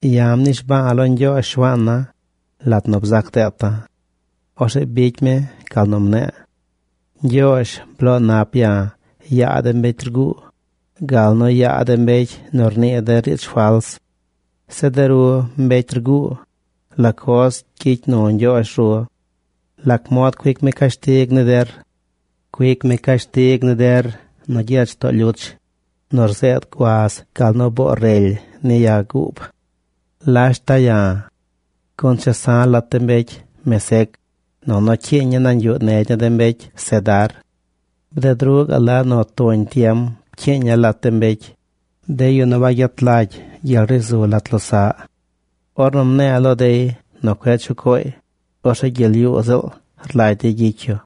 Ya̱ mnishba̱a̱ lo Ñgyoozh, Shuaan na, lat nu bzac deeta̱. Orzeꞌ bicy mi gal nu mne̱e̱. Ñgyoozh, bloo nap ya̱ yaa de mbecy rguu, gal nu yaa de mbecy nu rnii de riidz fals. Zeꞌ de ru, mbecy rguu, ¿la coz gyicy nu Ñgyoozh ru? ¿Lac mod cuic mi cashtig ni der? Cuic mi cashtig ni der nu gyech too lyuch nu rzeed guaz gal nu boo rely ni ya guub. ¡Lashta ya̱! Gun chesa̱ lat de mbecy Mesec, nunu cyiiña̱ nañ yuꞌ negy ni de mbecy Cedar. Bded ruꞌ gaꞌ la nu tuñ tiem pcyiiña̱ lat de mbecy, de yu nu wagyet lagy gyel ri zu lat losaꞌy. Ornu mne̱e̱ lo dey nu cueꞌ chuꞌ cooy, orzeꞌ gyel yuu ziꞌl rlagy dey gyicy yu.